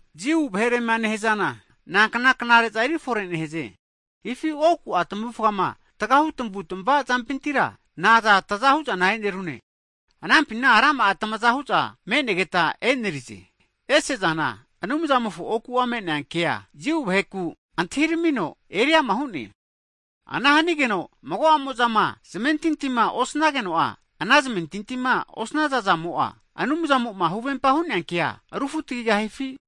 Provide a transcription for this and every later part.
Jiu vaherema nehazana, nankna knare'za eri forera nehaze? Hifi oku'a tavufgama tagahu tavutava zampintira na'a taza hu'zana enerize? Anampina rama'a tamaza hu'za me'negeta enerize! Ese zana Anumzamofo oku me'nea ke'a Jiu vaheku antahiramino eri'ama hu'ne. Ana hanigeno mago'amo'zama zamentintima osanageno'a, ana zamentintima osnazazamo'a, Anumzamo'ma huvempa hu'nea ke'a rufutagigahifi?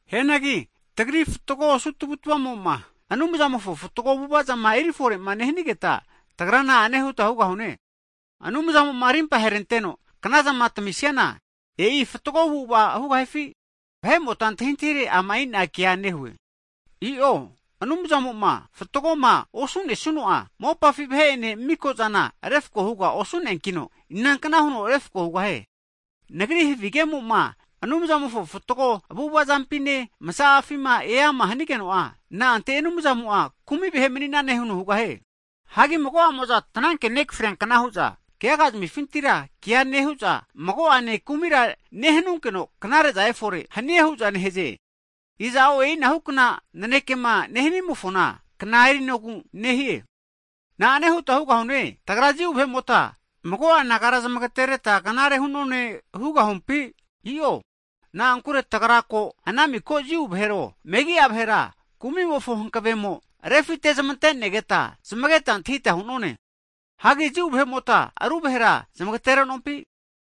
Hianagi tagri fatgo osu tavu'tavazamo'ma, Anumzamofo fatgo avu'avazama eri fore'ma nehanigeta, tagra na'ane huta hugahune? Anumzamo'ma rimpaheranteno knazama tamisiana, e'i fatgo avu'ava hugahifi? (Vahe'mota antahintahire, ama'ina kea nehue.) I'o, Anumzamo'ma fatgoma osu'nesuno'a mopafi vahe'ene mikozana refko huga osu'neankino, inankna huno refko hugahie? Nagri havigemo'ma Anumzamofo fatgo avu'avazampine masa'afima eama hanigeno'a, na'ante Anumzamo'a kumi vahe mani'nane huno hugahie? Hagi mago'amo'za tananke nekafriankna hu'za kegaga zamifintira kea nehu'za, mago'ane kumira nehanunkeno knare'za efore hanie hu'za nehaze. Iza'o e'inahukna nanekema nehanimo'a kna erinogu nehie. Hagi na'ane huta hugahune, tagra Jiu vahe'mota mago'a nagara zamagetereta knare hu'none hugahumpi? I'o, na'ankure tagra ko ana miko Jiu vahero, megi'a vahera kumimofo hankavemo refitezmantenegeta zamageta antahita hu'none. Hagi Jiu vahe'mota ru vahera zmageterenompi?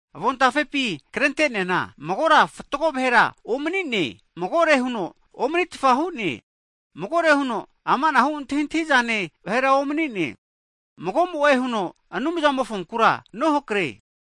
Avontafepi krente'neana, Magora fatgo vahera omani'ne. Magore huno omanitfa hu'ne. Magore huno ama' antahi'zane vahera omanine. Mago'mo'e huno Anumzamofonkura nohakre.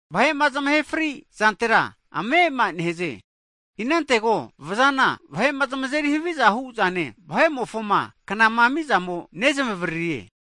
Vahe'ma zamahe fri zantera ame'ama nehaze. Inantego vazana vahe'ma zamazeri haviza hu'zane vahe'mofoma knama amizamo nezmavararie.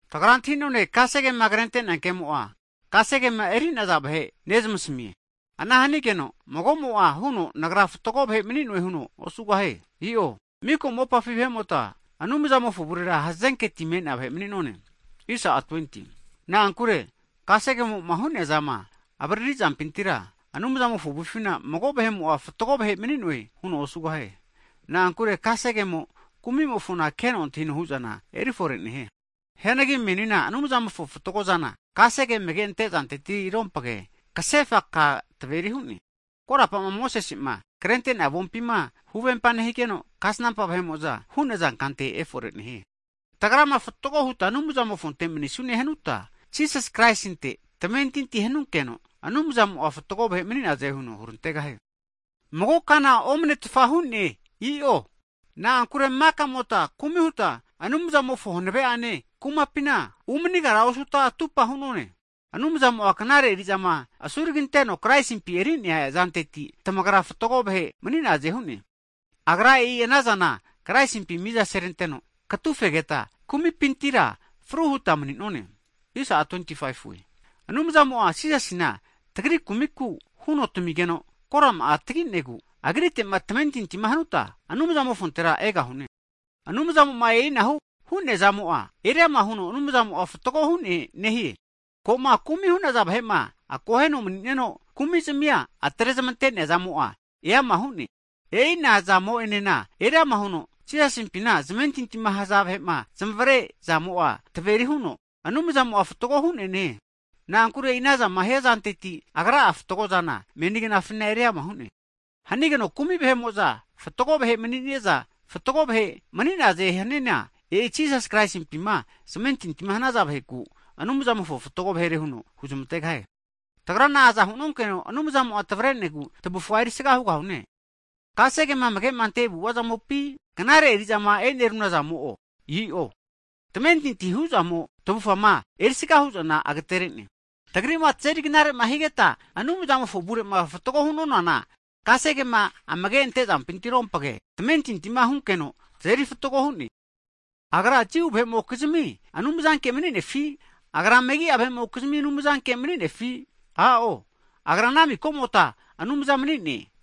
Tagra antahi'none kasegama krente'nea ke'mo'a kasegema eri'naza vahe nezmasamie. Ana hanigeno mago'mo'a huno nagra fatgo vahe mani'noe huno osugahie. I'o miko mopafi vahe'mota Anumzamofo avurera hazenketi me'nea vahe mani'none. Na'ankure kasegemo'ma hu'neazama avarari zampintira, Anumzamofo avufina mago vahe'mo'a fatgo vahe mani'noe huno osugahie. Na'ankure kasegemo, kumimofo keno antahino huzana erifore nehie. Hu'neanagi menina Anumzamofo fatgozana, kasege amage'ante zantetirompage, kasefa ka taveri hu'ne. Korapama Mosese'ma krente'nea avompima huvempa nehigeno, kasnampa vahe'mo'za hu'naza kante efore nehie. Tagrama fatgo huta Anumzamofonte manisune hanuta, Jisas Kraisinte tamentintia hanunkeno, Anumzamo'a fatgo vahe mani'naze huno hurantegahie. Mago kana omnetfa hu'ne. I'o. Na'ankure maka'mota kumi huta Anumzamofona hanave'ane kumapina umanigara osuta, atupa hu'nonane. Anumzamo'a knare eri'zama asuragiranteno Kraisimpi eri'nea zanteti, tamagra fatgo vahe mani'naze hu'ne. Agra e'i ana zana Kraisimpi miza seranteno katufegeta, kumipintira fru huta mani'none. Anumzamo'a, Jisasina tamigeno kumitimofo nona huno korama'a tagino, kumitia apaserante'nea zamo'a Anumzamo'a agru huno fatgo hu'neankita, Agritema tamentinti hanuta Anumzamofontera egahune. Anumzamo'ma e'inahu hu'neazamo, Anumzamo'a fatgo hu'ne nehie. Ko'ma kumi hu'naza vahe'ma akoheno mani'neno kumizmia atrezmante'nea zamo'a eama hu'ne. E'ina zamo'enena eriama huno Jisasimpima zamentintima haza vahe'ma nezmavrea zamo'a taveri huno Anumzamo'a fatgo hu'ne nehie. Na'ankure e'i anazama hiazanteti, Agra'a fatgozana meni knafina eriama nehie. Hanigeno kumi vahe'mo'za fatgo vahe mani'naze haniana, e'i Jisasi Kraisimpima zamentinti hanaza vaheku Anumzamo'a fatgo vahere huno huzmantegahie. Hagi tagra naza hunonkeno Anumzamo'a tavrenegu tavufga erisaga hugahune? Kasegema amage'ma ante avu'avazamopi? Knare eri'zama e'nerunazamo'o? I'o. Tamentintima hu'zamo tavufama erisga hu'zana agatere'ne. Tagri'ma tazeri knare'ma higeta Anumzamofo avure'ma fatgo hu'nonana kasegema amage'ante zampitiro'ompge tamentitima hunkeno tazeri fatgo hu'ne. Agra, Jiu vahe'mokizimi Anumzanke mani'nefi? Agra megi'a vahe'mokizimi Anumzanke maninefi? I'o, Agra ana mikomota Anumza mani'ne.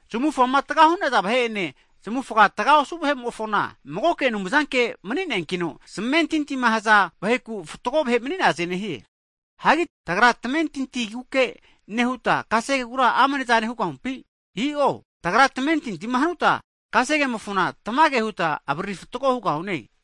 Zamufga taga hu'naza vahe'ene, zamufa taga osu vahe'mofona, Magoke Anumzanke mani'neankino, zamentintima haza vaheku fatgo vahe mani'naze nehie. Hagi tagra tamentintiguke nehuta, kasegegura amnezane hugahumpi? I'o, tagrama tamentintima hanuta kasegemofona tamage huta avariri fatgo hugahune.